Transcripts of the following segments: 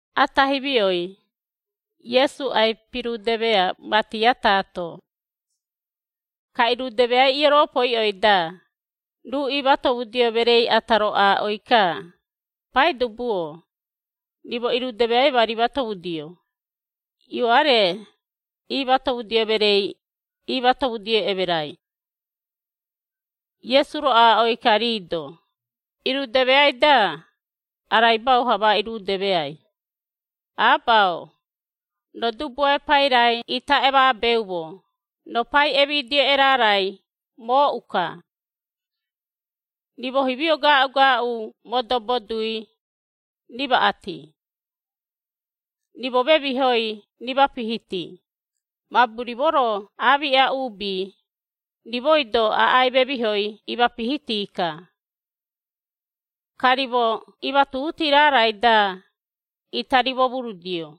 Ata himioi, Iesu ai-pirudemea mati ataato. Ka irudemeai ioropoiꞌoi-da, ruu iimatomudio mereei ata-ro aaꞌoi-ka, “Paidubu-o, rimo irudemeai ma rimatomudio, Ioare, iimatomudio mereei, iimatomudio emerai.” Iesu-ro aaꞌoi-ka rii-do, “Irudemeai-da, araibau-ha ma irudemeai, Aba-o, Roo dubuae pairai ita emaabeumo; Roo pai emidio erarai mooꞌu-ka. Rimo himio gaaꞌu-gaaꞌu modobo dui, rimaꞌati. Rimo memihoi rimapihiti, mabu rimo-ro aamiꞌa uubi, rimoi-do aꞌai memihoi imapihiti-ka. Ka rimo imatuhuti raarai-da, ita rimomurudio.”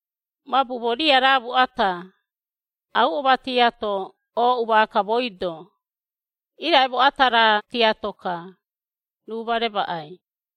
Mabu moo riaraamu ata, auꞌo matiato ooꞌu maaka mooi-do, irai moo ata raa tiato-ka, ruu ma remaꞌai!’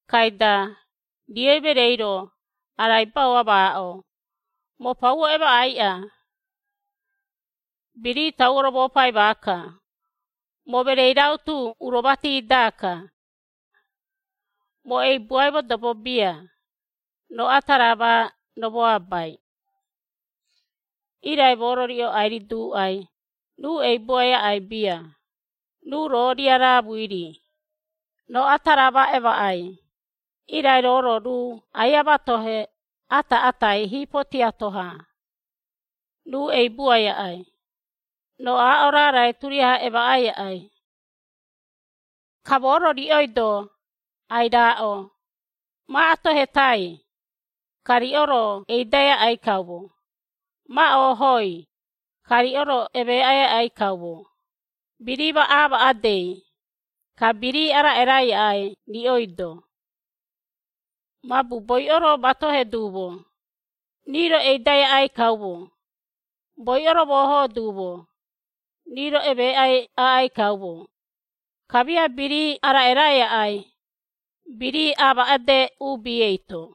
Kaida, rioi mereei-ro, araibau amaaꞌo, ‘Moo pauo emaꞌaiꞌa! Birii tauo romoopai maaka, moo mereei rautu uro mati-daka. Moo eibuai modobo bia, roo ata raa ma romoabai.’ Irai moo-ro riꞌo ai-riduuꞌai, ruu eibuai aꞌai bia, ruu roo riaraamui-ri, roo ata raa ma emaꞌai, irai roo-ro ruu aia matohe ata-atai hiipo tiato-ha, ruu eibuai aꞌai, roo aaꞌo raarai turiaha emaꞌai aꞌai. “Ka moo-ro riꞌoi-do ai-raaꞌo, ma atoheitai, ka riꞌo-ro eidai aꞌai kaumo, ma oohoi, ka riꞌo-ro emeeꞌai aꞌai kaumo, birii ma aamaꞌedei, ka birii araꞌerai aꞌai riꞌoi-do. Mabu boiꞌo-ro matohe duumo, rii-ro eidai aꞌai kaumo, boiꞌo-ro moohoo duumo, rii-ro emeeꞌai aꞌai kaumo, kamia birii araꞌerai aꞌai, birii amaaꞌede uubi eito.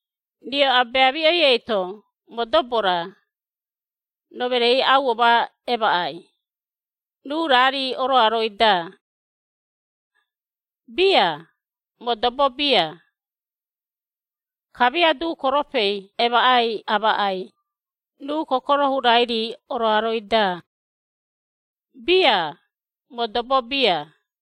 Riꞌo abeamiꞌoi eito modobo-ra, roo mereei auo ma emaꞌai, ruu raa-ri oroaroi-da? Bia, modobo bia! Kamia duukoropei emaꞌai amaꞌai, ruu kokoro hurai-ri oroaroi-da? Bia, modobo bia!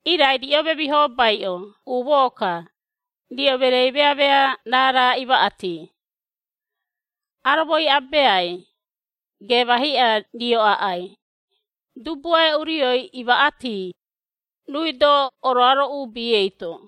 Irai riꞌo memihobaiꞌo umoo-ka, riꞌo mereei meamea raara imaꞌati. Aromoi Abeai, geema hiꞌa rio aꞌai, Dubuae Urioi imaꞌati, ruui-do oroaro uubi eito.”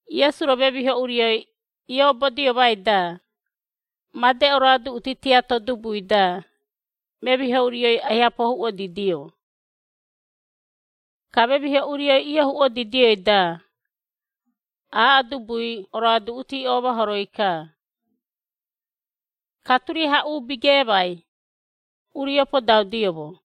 Iesu-ro memiho urioi iobodiomai-da, made oroaduꞌuti tiato dubui-da, memiho urioi aiha pohuuꞌodidio. Ka memiho urioi iohuuꞌodidioi-da, aaꞌo dubui oroaduꞌuti oomahoroi-ka. Ka turiaha uubi geemai, urio podaudioumo.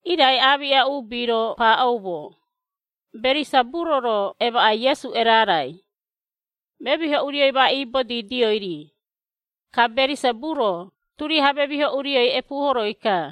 Irai aamiꞌa uubi-ro paaꞌoumo, “Berisaburo-ro emaꞌai Iesu erarai, memiho urioi ma ibodiidio-ri. Ka Berisaburo turiaha memiho urioi epuuhoroi-ka.”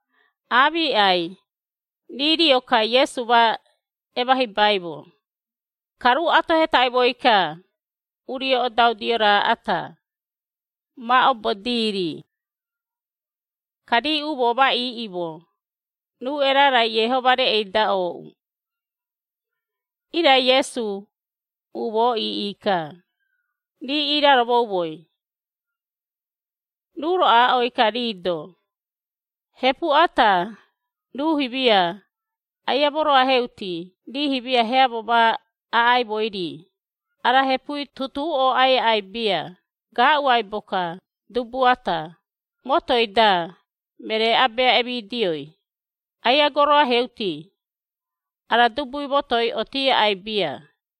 Aamiꞌai, rii rio-ka Iesu ma emahibaimo, ka ruu atohetaimoi-ka, urio odaudio raa ata, ma obodii-ri. Ka rii umoo ma iiꞌimo, ruu erarai Iehoma reꞌei-da ooꞌu. Irai Iesu, umoo iiꞌi-ka, rii iiraromoumoi. Ruu-ro aaꞌoi-ka rii-do, “Hepu ata, ruu himia, aia moroaheuti rii himia heamo ma aꞌaimoi-ri, ara hepui tutuu ooꞌai aꞌai bia, gaaꞌu aibo-ka, dubu ata, motoi-da, meree Abea emidioi, aia goroaheuti, ara dubui motoi otii aꞌai bia.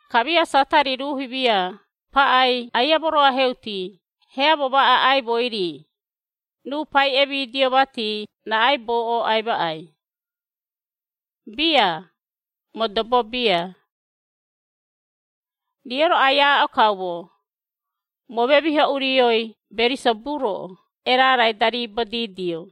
Kamia Satari ruu himia paꞌai aia moroaheuti heamo ma aꞌaimoi-ri, ruu pai emidioi mati raꞌaibou ooꞌai maꞌai? Bia, modobo bia! Riꞌo-ro ai-aaꞌo kaumo, moo memiho urioi Berisaburo erarai-da riibodiidio.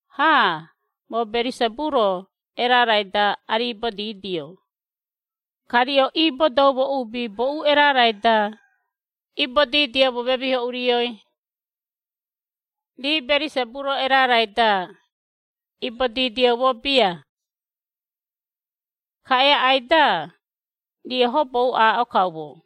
Ha, moo Berisaburo erarai-da ariibodiidio, ka riꞌo iibodoumo uubi boꞌu erarai-da, iibodiidioumo memiho urioi? Rii Berisaburo erarai-da, ibodidioumo bia. Ka eaꞌai-da, riꞌo hobou aaꞌo kaumo!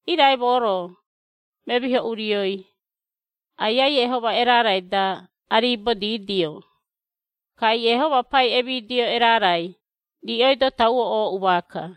Irai moo-ro, memiho urioi, Aiai Iehoma erarai-da ariibodiidio, ka Iehoma Pai emidio erarai, riꞌoi-do tauo ooꞌu maaka.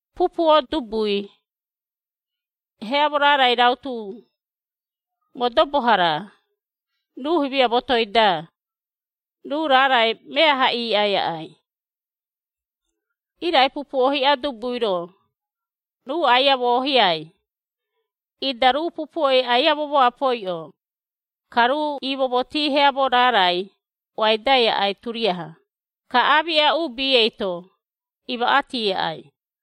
“Pupuo dubui, heamo raarai rautu, modobo-hara, ruu himia motoi-da, ruu raarai meaha iiꞌai aꞌai. Irai pupuo hiꞌa dubui-ro, ruu aia moohiai, ida ruu pupuoi aia momoapoiꞌo, ka ruu iimomotii heamo raarai oaidai aꞌai turiaha, ka aamiꞌa uubi eito, imaꞌati aꞌai.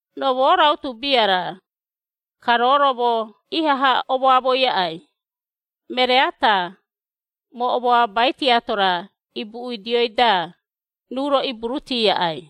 “Roo, moo rautu bia-ra, ka roo-ro moo ihaha omoamoi aꞌai; meree ata, moo omoabai tiato-ra ibuꞌiidioi-da, ruu-ro iburuti aꞌai.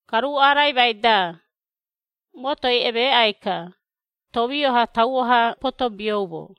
Ka ruu araimai-da, motoi emeeꞌai-ka, tomio-ha tauo-ha potobioumo.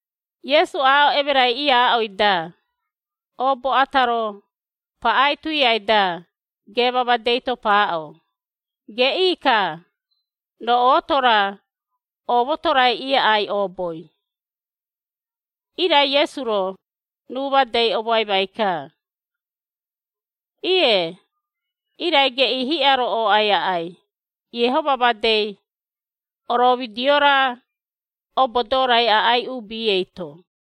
Iesu, aaꞌo emerai iaaꞌoi-da, oobo ata-ro, paꞌai tuiai-da, geema madei-to paaꞌo, “Geꞌii-ka, roo ooto-ra, oomoto-rai iaꞌai ooboi!” Irai Iesu-ro, ruu madei omoaimai-ka. “Ie, irai geꞌii hiꞌa-ro ooꞌai aꞌai, Iehoma madei, oroomidio-ra, obodoo-rai aꞌai uubi eito.”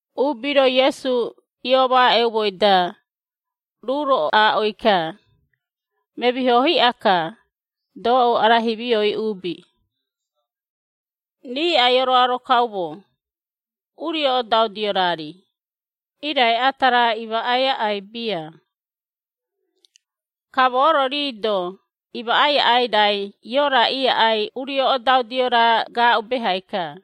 Uubi-ro Iesu iomaaꞌeumoi-da, ruu-ro aaꞌoi-ka, “Memiho hiꞌa-ka, doꞌou ara himioi uubi! Rii ai-oroaro kaumo, urio odaudio raa-ri, irai ata raa imaꞌai aꞌai bia. Ka moo-ro rii-do imaꞌai aꞌai raai Iora iaꞌai urio odaudio raa gaaꞌu behai-ka.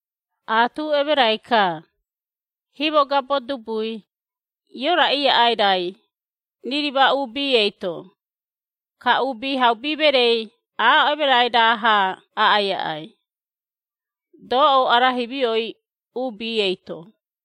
Aatu emerai-ka, himogabo dubui, Iora iaꞌai raai, Ririma uubi eito, ka Uubihaubi Mereei aaꞌo emerai raa-ha aꞌai aꞌai, doꞌou ara himioi uubi eito.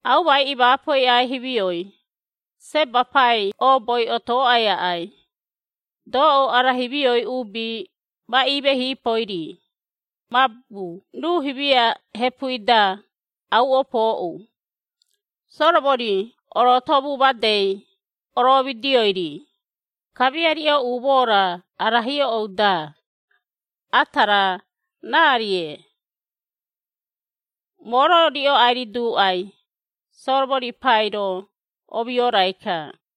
Aumai imaapoi aꞌai himioi, Seba pai ooboi otooꞌai aꞌai, doꞌou ara himioi uubi ma imehiipoi-ri, mabu ruu himia hepui-da, auꞌo pooꞌu, Soromori orootomu madei oroomidioi-ri, kamia riꞌo umoo-ra ara hioꞌou-da, ata raa, raa-rie. Moo-ro riꞌo ai-riduuꞌai Soromori pai-ro omioorai-ka.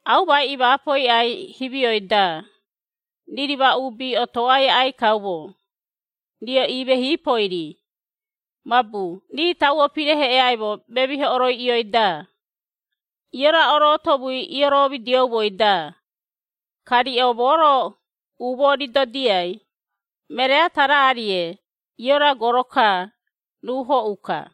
Aumai imaapoi aꞌai himio-da, Ririma uubi otooꞌai aꞌai kaumo, riꞌo imehiipoi-ri, mabu rii tauo pireheꞌeaimo memiho oroiꞌioi-da, Iora orootomui iiromidioumoi-da, ka riꞌo moo-ro umoo ridodiai, meree ata raa-rie Iora goro-ka, ruu hoꞌu-ka!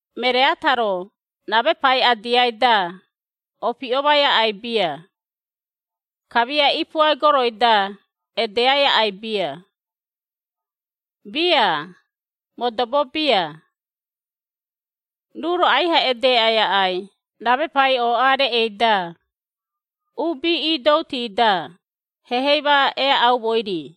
“Meree ata-ro ramepai adiai-da, opiꞌomai aꞌai bia, kamia ipuai goroi-da edeꞌai aꞌai bia. Bia modobo bia! Ruu-ro aiha edeeꞌai aꞌai ramepai ooꞌa reꞌei-da, uubi iidouti-da, hehei ma eaꞌaumoi-ri.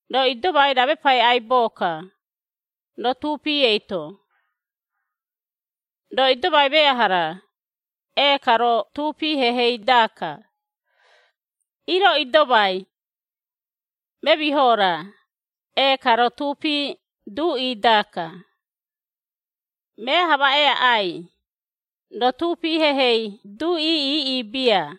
Roo idomai ramepai aibo-ka, roo tuupi eito. Roo idomai meaha-ra, ee-ka roo tuupi hehei-daka. Ii roo idomai memiho-ra, ee-ka roo tuupi duꞌi-daka. Meaha ma ereaꞌai, roo tuupi hehei duꞌi iiꞌi bia!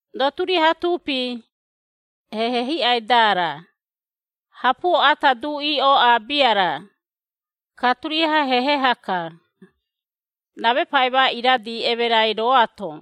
Roo turiaha tuupi, hehe hiꞌai-dara, hapuo ata duꞌi ooꞌa bia-ra, ka turiaha hehe-haka, ramepai ma iradi emerai rooato.”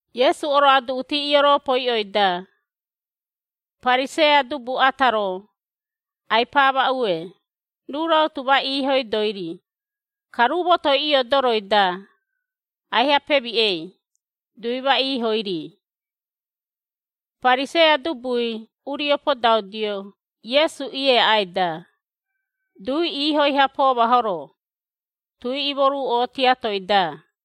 Iesu oroaduꞌuti ioropoiꞌoi-da, Pariseia dubu ata-ro, ai-paamaꞌue, ruu rautu ma iihoidoi-ri, ka ruu motoi iodoroi-da, aiha pemiꞌei, dui ma iihoi-ri. Pariseia dubui urio podaudio Iesu ieaꞌai-da, dui iihoi-ha poomahoro, tui imoruꞌo tiatoi-da.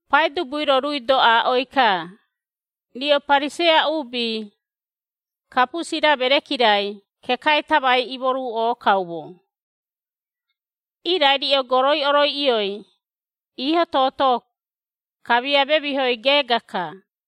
Paidubui-ro ruui-do aaꞌoi-ka, “Riꞌo Pariseia uubi, kapusi-ra mereki-rai kekai tamai imoruꞌo kaumo. Irai riꞌo goroi oroiꞌioi, iiho-toto, kamia memihoi geega-ka.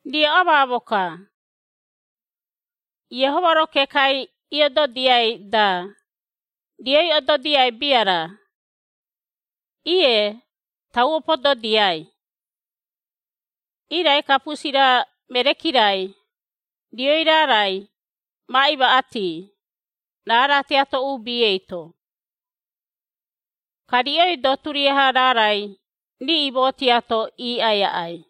Riꞌo amaamo-ka! Iehoma-ro kekai iododiai-da, rioi ododiai bia-ra? Ie, tauo pododiai. Irai kapusi-ra mereki-rai, rioi raarai, ma imaꞌati, raara tiato uubi eito. Ka riꞌoi-do turiaha raarai riiꞌimo tiato iiꞌai aꞌai.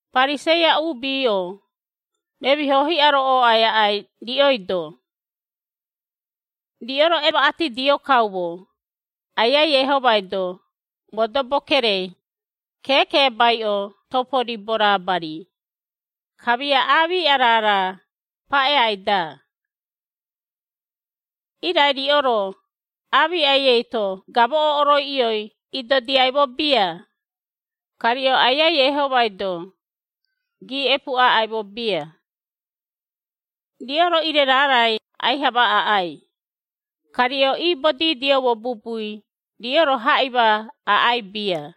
“Pariseia uubi-o, memiho hiꞌa-ro ooꞌai aꞌai riꞌoi-do! Riꞌo-ro emaꞌatidio kaumo, Aiai Iehomai-do, modobo kerei, keekeebaiꞌo topo ribo raabari, kamia aamiꞌa raara paꞌeai-da. Irai riꞌo-ro, aamiꞌai eito gamoꞌo oroiꞌioi idodiaimo bia, ka riꞌo Aiai Iehomai-do, giiꞌepu aꞌaimo bia. Riꞌo-ro ire raarai aiha ma aꞌai, ka riꞌo iibodiidioumo bubui riꞌo-ro haꞌima aꞌai bia.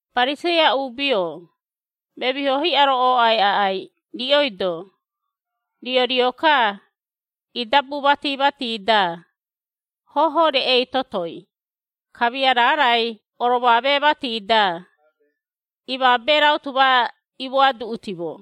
“Pariseia uubi-o, memiho hiꞌa-ro, ooꞌai aꞌai, riꞌoi-do! Riꞌo rio-ka idabu mati-mati-da, hoho reꞌei totoi, kamia raarai oromoamee mati-da, imaabee rautu ma imoaduꞌutimo.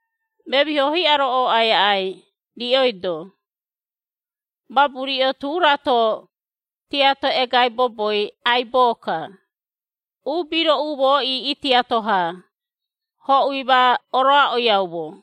Memiho hiꞌai ooꞌai aꞌai riꞌoi-do, mabu riꞌo, tu rato tiato egai boboi aibo-ka, uubi-ro umoo iiꞌi tiato-ha, hoꞌui ma oroaꞌoiaumo.”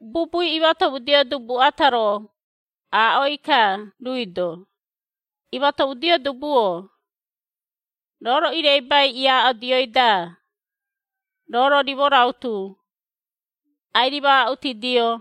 Bubui imatomudio dubui ata-ro, aaꞌoi-ka ruui-do, “Imatomudio dubu-o, roo-ro ireibai iaaꞌodioi-da, roo-ro rimo rautu, ai-rimaaꞌutidio!”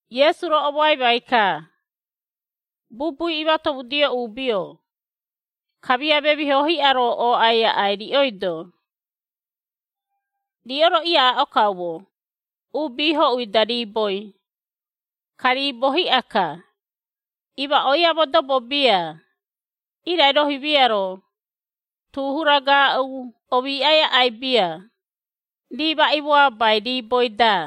Iesu-ro omoaimai-ka, “Bubui imatomudio uubi-o, kamia memiho hiꞌa-ro ooꞌai aꞌai riꞌoi-do! Riꞌo-ro iaaꞌo kaumo, uubi hoꞌui-da riiboi, ka riibo hiꞌa-ka, imaꞌoiai modobo bia, irai roo himia-ro, tu hura gaaꞌu omiiꞌai aꞌai bia, rii ma imoabai riiboi-da.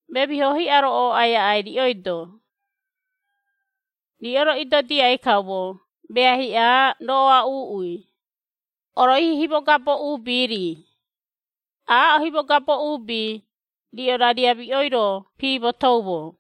Memiho hiꞌa-ro ooꞌai aꞌai riꞌoi-do! Riꞌo-ro idodiai kaumo mea hiꞌa roꞌoa uuꞌui, oroihi himogabo uubi-ri, aaꞌo himogabo uubi, riꞌo rariamiꞌoi-ro piimotoumo.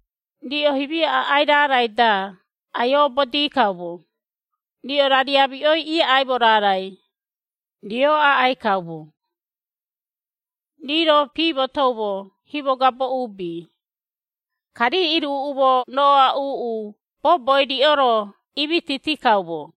Riꞌo himia aꞌai raarai-da ai-oobodi kaumo, riꞌo rariamiꞌoi iaꞌaimo raarai, rio aꞌai kaumo. Rii-ro piimotoumo himogabo uubi, ka rii iruꞌumo roꞌoa uuꞌu boboi riꞌo-ro imititi kaumo.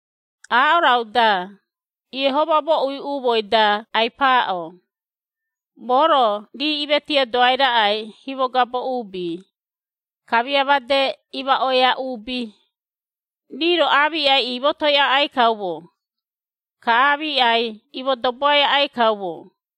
Aaꞌo raꞌu-da, Iehoma mooꞌui umooi-da ai-paaꞌo, ‘Moo-ro, rii imetiodoai raꞌai himogabo uubi, kamia made imaꞌoia uubi, rii-ro aamiꞌai iimotoi aꞌai kaumo, ka aamiꞌai imodoboai aꞌai kaumo.’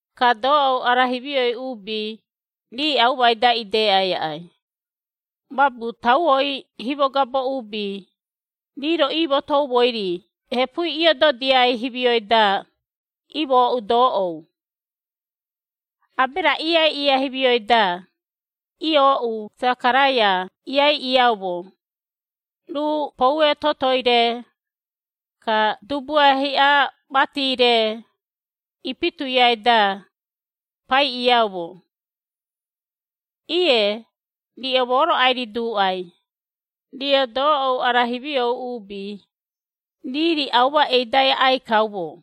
Ka doꞌou ara himioi uubi rii aumai-da ideꞌai aꞌai, mabu tauoi himogabo uubi, rii-ro iimotoumoi-ri hepui iododiai himioi-da, imooꞌu doꞌou. Abera iaiꞌiia himioi-da, iooꞌu Sekaraia iaiꞌiiaumo, ruu poue totoi-re, ka dubuae hiꞌa mati-re, ipituiai-da, paiꞌiiaumo. Ie, riꞌo moo-ro ai-riduuꞌai, riꞌo doꞌou ara himiou uubi, rii-ri auma eidai aꞌai kaumo.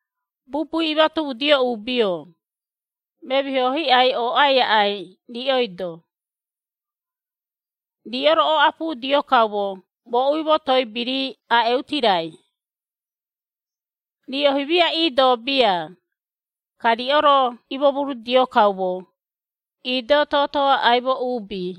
“Bubui imatomudio uubi-o, memiho hiꞌai ooꞌai aꞌai riꞌoi-do! Riꞌo-ro oꞌapudio kaumo moꞌui motoi birii aꞌeuti raai. Riꞌo himia iidoo bia, ka riꞌo-ro imomurudio kaumo, iido tooto aꞌaimo uubi!”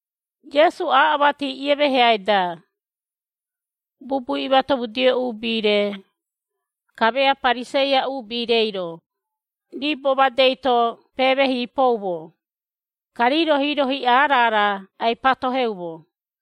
Iesu, aaꞌo mati iemeheai-da, bubui imatomudio uubi-re, kamia Pariseia uubi-reiro, riibo madei-to peemeehiipoumo, ka rii-ro hiiro hiꞌa raara ai-patoheumo.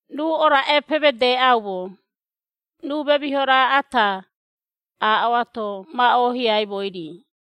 Ruu oraꞌe pemedeꞌaumo, ruu memiho raa ata, aaꞌoato ma oohiaimoi-ri.